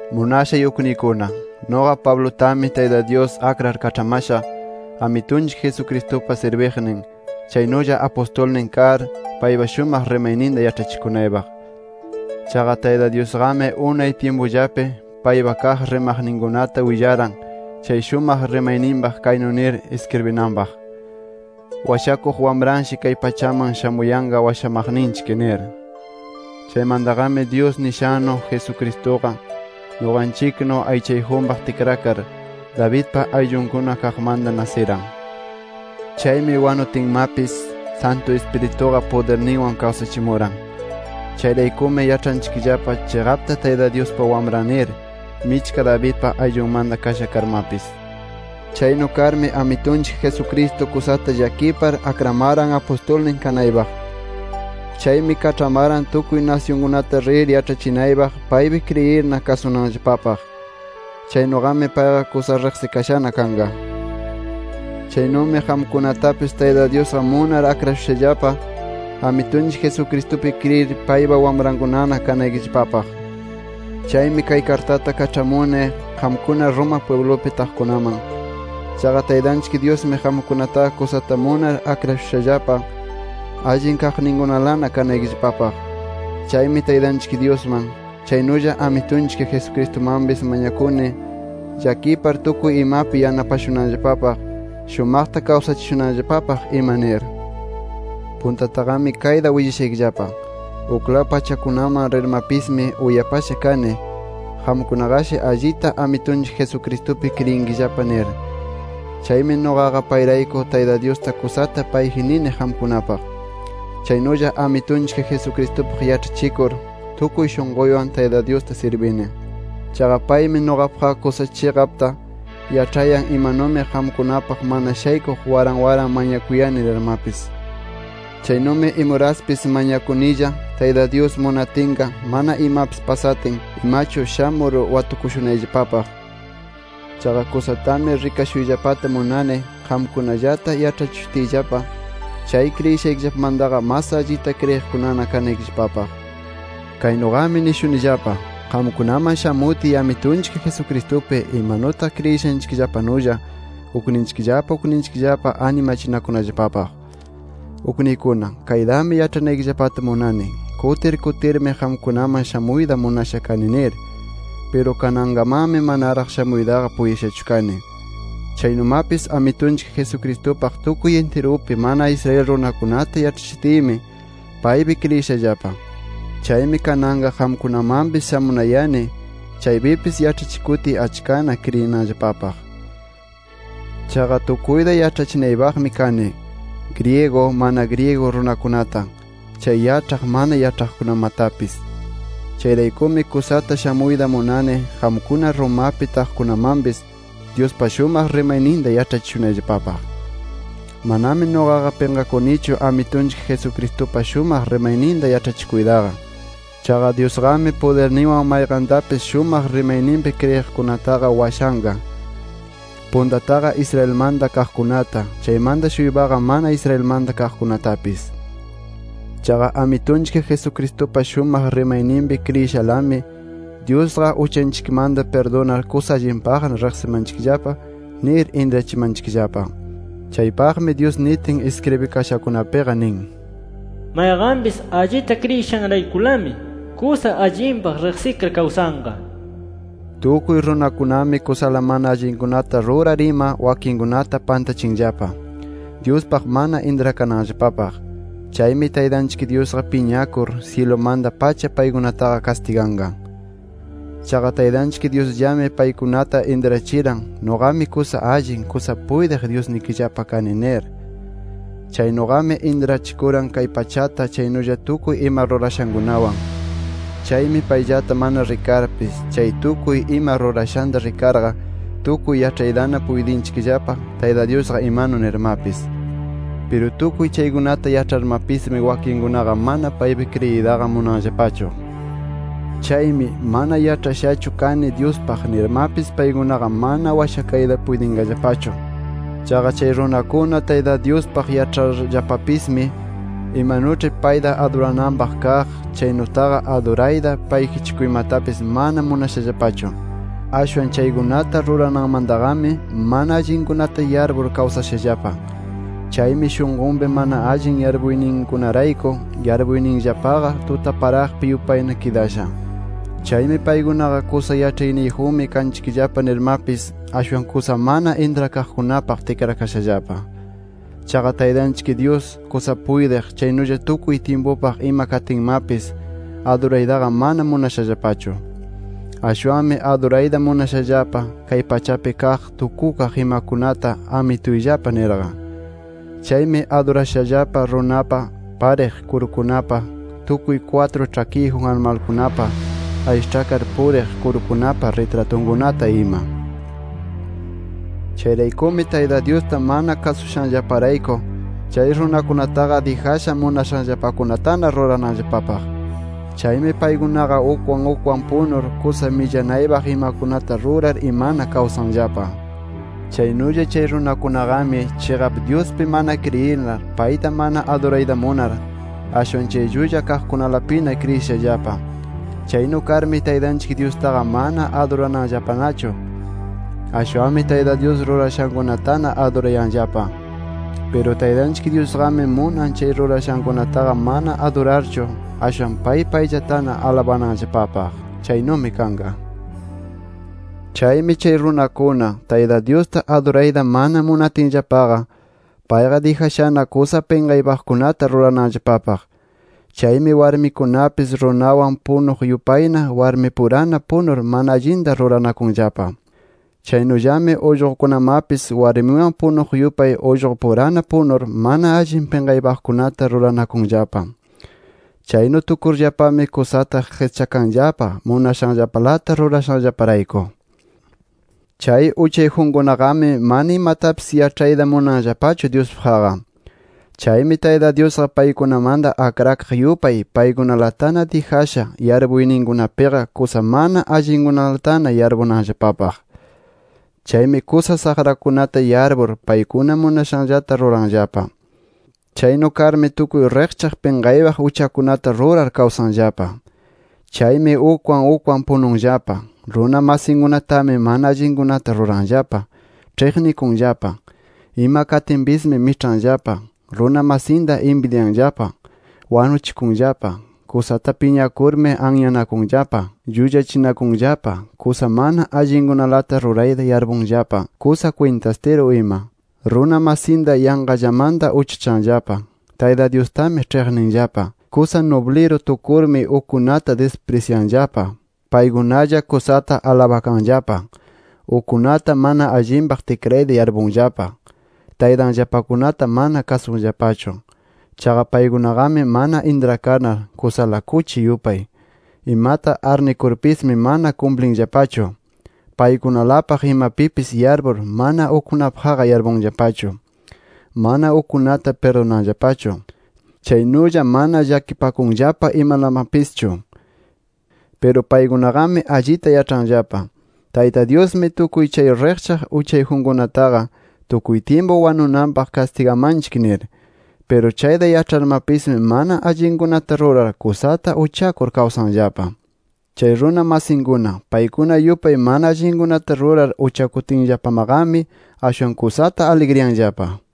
Munashay ukniykuna, nuqa Pablutami Tayta Dyus akrar kaĉhamasha Amitunchik Jesucristupa sirbiqnin, chaynulla apustulnin kar, paypa shumaq rimayninta yaĉhachikunaypaq. Chaqa Tayta Dyusqami unay tyimpullapi paypa kaq rimaqninkunata willaran chay shumaq rimayninpaq kaynu nir iskribinanpaq: “Washakuq Wamranshi kay pachaman shamuyanqa washamaqninchik” nir. Chaymantaqami Dyus nishannu, Jesucristuqa nuqanchiknu aychayjunpaq tikrakar Davidpa ayllunkuna kaqmanta nasiran. Chaymi wanutinmapis, Santu Ispirituqa pudirninwan kawsachimuran. Chayraykumi yaĉhanchikllapa chiqapta Tayta Dyuspa Wamran nir, michka Davidpa ayllunmanta kasha karmapis. Chaynu karmi Amitunchik Jesucristo kusata llakipar akramaran apustulnin kanaypaq. Chaymi kaĉhamaran tukuy nasyunkunata rir yaĉhachinaypaq paypi kriyirna kasunanllapapaq. Chaynuqami payqa kusa riqsikashana kanqa. Chaynumi qamkunatapis Tayta Dyusqa munar akrashushallapa, Amitunchik Jesucristupi kriyir paypa wamrankunana kanaykillapapaq. Chaymi kay kartata kaĉhamuni qamkuna Roma pwiblupi taqkunaman. Chaqa Taytanchik Dyusmi qamkunataqa kusata munar akrashushallapa, allin kaqninkunalana kanaykillapapaq. Chaymi Taytanchik Dyusman, chaynulla Amitunchik Jesucristumanpis mañakuni, llakipar tukuy imapi yanapashunanllapapaq, shumaqta kawsachishunanllapapaq ima nir. Puntataqami kayta willashaykillapa: Uklaw pachakunaman rirmapismi uyapasha kani, qamkunaqashi allita, Amitunchik Jesucristupi kriyinkillapa nir. Chaymi nuqaqa payrayku, Tayta Dyusta kusata payji nini qamkunapaq. Chaynulla Amitunchik Jesucristupaq yaĉhachikur, tukuy shunquywan Tayta Dyusta sirbini. Chaqa paymi nuqapaqqa kusa chiqapta yaĉhayan imanumi qamkunapaq mana shaykuq waran waran mañakuyani nirmapis. Chaynumi imuraspis mañakunilla Tayta Dyus munatinqa, mana imapis pasatin imachu shamur watukushunayllapapaq. Chaqa kusatami rikashuyllapata munani, qamkunallata yaĉhachishutiyllapa chay kriyishaykillapamantaqa mas allita kriyiqkunana kanaykillapapaq. Kaynuqami nishunillapa: Qamkunaman shamutiy, Amitunchik Jesucristupi imanutaq kriyishanchikllapanulla ukninchikllapa ukninchikllapa animachinakunallapapaq. Ukniykuna, kaytami yaĉhanaykillapata munani: Kutir kutirmi qamkunaman shamuyta munasha kani nir. Piru kanankamanmi manaraq shamuytaqa puytishachu kani. Chaynumapis, Amitunchik Jesucristupaq tukuy intirupi mana Israel runakunata yaĉhachitiymi, paypi kriyishallapa. Chaymi kananqa qamkunamanpis shamunayani, chaypipis yaĉhachikutiy achkana kriyinanllapapaq. Chaqa tukuyta yaĉhachinaypaqmi kani, griego mana griego runakunata, chay yaĉhaq mana yaĉhaqkunamatapis. Chayraykumi kusata shamuyta munani qamkuna Romapi taqkunamanpis, Dyuspa shumaq rimayninta yaĉhachishunayllapapaq. Manami nuqaqa pinqakunichu Amitunchik Jesucristupa shumaq rimayninta yaĉhachikuytaqa. Chaqa Dyusqami pudirninwan mayqantapis, shumaq rimayninpi kriyiqkunataqa washanqa, puntataqa Israelmanta kaqkunata, chaymanta-shuypaqa mana Israelmanta kaqkunatapis. Chaqa Amitunchik Jesucristupa shumaq rimayninpi kriyishalami, Dyusqa uchanchikmanta pirdunar, kusa allinpaqna riqsimanchikllapa nir intrachimanchikllapa. Chaypaqmi Dyus nitin iskribikashakunapiqa nin: “Mayqanpis allita kriyishanraykulami, kusa allinpaq riqsikar kawsanqa” nir. Tukuy runakunami kusala mana allinkunata rurar ima, wakinkunata pantachinllapa Dyuspaq mana intrakananllapapaq. Chaymi Taytanchik Dyusqa piñakur, syilumanta-pacha paykunataqa kastiganqa. Chaqa Taytanchik Dyusllami paykunata intrachiran, nuqami kusa allin, kusa puytiq Dyusnikillapa kani nir. Chaynuqami intrachikuran, kay pachata, chaynulla tukuy ima rurashankunawan. Chaymi payllata mana rikarpis, chay tukuy ima rurashanta rikarqa, tukuy yaĉhaytana puytinchikllapa Tayta Dyusqa imanu nirmapis. Piru tukuy chaykunata yaĉharmapismi, wakinkunaqa mana paypi kriyiytaqa munanllapachu. Chaymi, “Mana yaĉhashachu kani Dyuspaq” nirmapis, paykunaqa mana washakayta puytinqallapachu. Chaqa chay runakuna Tayta Dyuspaq yaĉharllapapismi, imanuĉhi payta adurananpaq kaq chaynutaqa adurayta, payjichikuymatapis mana munashallapachu. Ashwan chaykunata rurananmantaqami mana allinkunata yarpur kawsashallapa. Chaymi shunqunpi mana allin yarpuyninkunarayku, yarpuyninllapaqa tutaparaqpi yupayna kidasha. Chaymi paykunaqa “Kusa yaĉhayniyjunmi kanchikllapa” nirmapis, ashwan kusa mana intrakaqkunapaq tikrakashallapa. Chaqa Taytanchik Dyus kusa puytiq, chaynulla tukuy tyimpupaq ima katinmapis, aduraytaqa mana munashallapachu. Ashwanmi adurayta munashallapa kay pachapi kaq tukukaq imakunata amituyllapa nirqa. Chaymi adurashallapa runapa, pariq kurukunapa, tukuy kwatru ĉhakiyjun animalkunapa, aysaĉhakar puriq kurukunapa ritratunkunata ima. Chayraykumi Tayta Dyusta mana kasushanllaparayku, chay runakunataqa dijasha munashanllapakunatana rurananllapapaq. Chaymi paykunaqa ukwan ukwan punur, kusa millanaypaq imakunata rurar imana kawsanllapa. Chaynulla chay runakunaqami, chiqap Dyuspi mana kriyinar, payta adurayta mana munar, ashwan chay llulla kaqkunalapina kriyishallapa. Chaynu karmi, Taytanchik Dyustaqa mana adurananllapanachu. Ashwanmi Tayta Dyus rurashankunatana adurayanllapa. Piru Taytanchik Dyusqami munan, chay rurashankunataqa mana adurarchu, ashwan pay payllatana alabanallapapaq. Chaynumi kanqa. Chaymi chay runakuna, Tayta Dyusta adurayta mana munatinllapaqa, payqa dijashana kusa pinqaypaqkunata rurananllapapaq. Chaymi warmikunapis runanwan punuq yupayna warmipurana punur mana allinta ruranakunllapa. Chaynullami ullqukunamapis warminwan punuq yupay ullqupurana punur, mana allin pinqaypaqkunata ruranakunllapa. Chaynu tukurllapami, kusata qischakanllapa munashanllapalata rurashanllaparayku. Chay uchayjunkunaqami mana imatapis yaĉhayta munanllapachu Dyuspaqqa. Chaymi Tayta Dyusqa paykunamanta akrakaq yupay, paykunalatana dijasha yarpuyninkunapiqa kusa mana allinkunalatana yarpunanpaq. Chaymi kusa saqrakunatana yarpur, paykuna munashanllata ruranllapa. Chaynu karmi tukuy riqchaq pinqaypaq uchakunata rurar kawsanllapa. [Chaymi ukwan ukwan pununllapa.] Runa masinkunatami mana allinkunata ruranllapa. Ĉhiqnikunllapa. Iman katinpismi, miĉhanllapa. Runa masinta inbidyanllapa. Wanuchikunllapa. Kusata piñakurmi anyanakunllapa. Llullachinakunllapa. Kusa mana allinkunalata rurayta yarpunllapa. Kusa kwintastiru ima. Runa masinta yanqallamanta uchachanllapa. Tayta Dyustami ĉhiqninllapa. Kusa nubliru tukurmi, ukkunata disprisyanllapa. Paykunalla kusata alabakanllapa. Ukkunata mana allinpaq tikrayta yarpunllapa. Taytanllapakunata mana kasunllapachu. Chaqa paykunaqami mana intrakanar kusala kuchi yupay. Imata arnikurpismi, mana kumplinllapachu. Paykunalapaq imanpipis yarpur, mana ukkunapaqqa yarpunllapachu. Mana ukkunata pirdunanllapachu. Chaynulla mana llakipakunllapa imalamapischu. Piru paykunaqami allita yaĉhanllapa Tayta Dyusmi tukuy chay riqchaq uchayjunkunataqa tukuy tyimpu wanunapaq kastigamanchik nir. Piru chayta yaĉharmapismi mana allinkunata rurar kusata uchakur kawsanllapa. Chay runa masinkuna paykuna yupay mana allinkunata rurar uchakutinllapamaqami, ashwan kusata aligriyanllapa.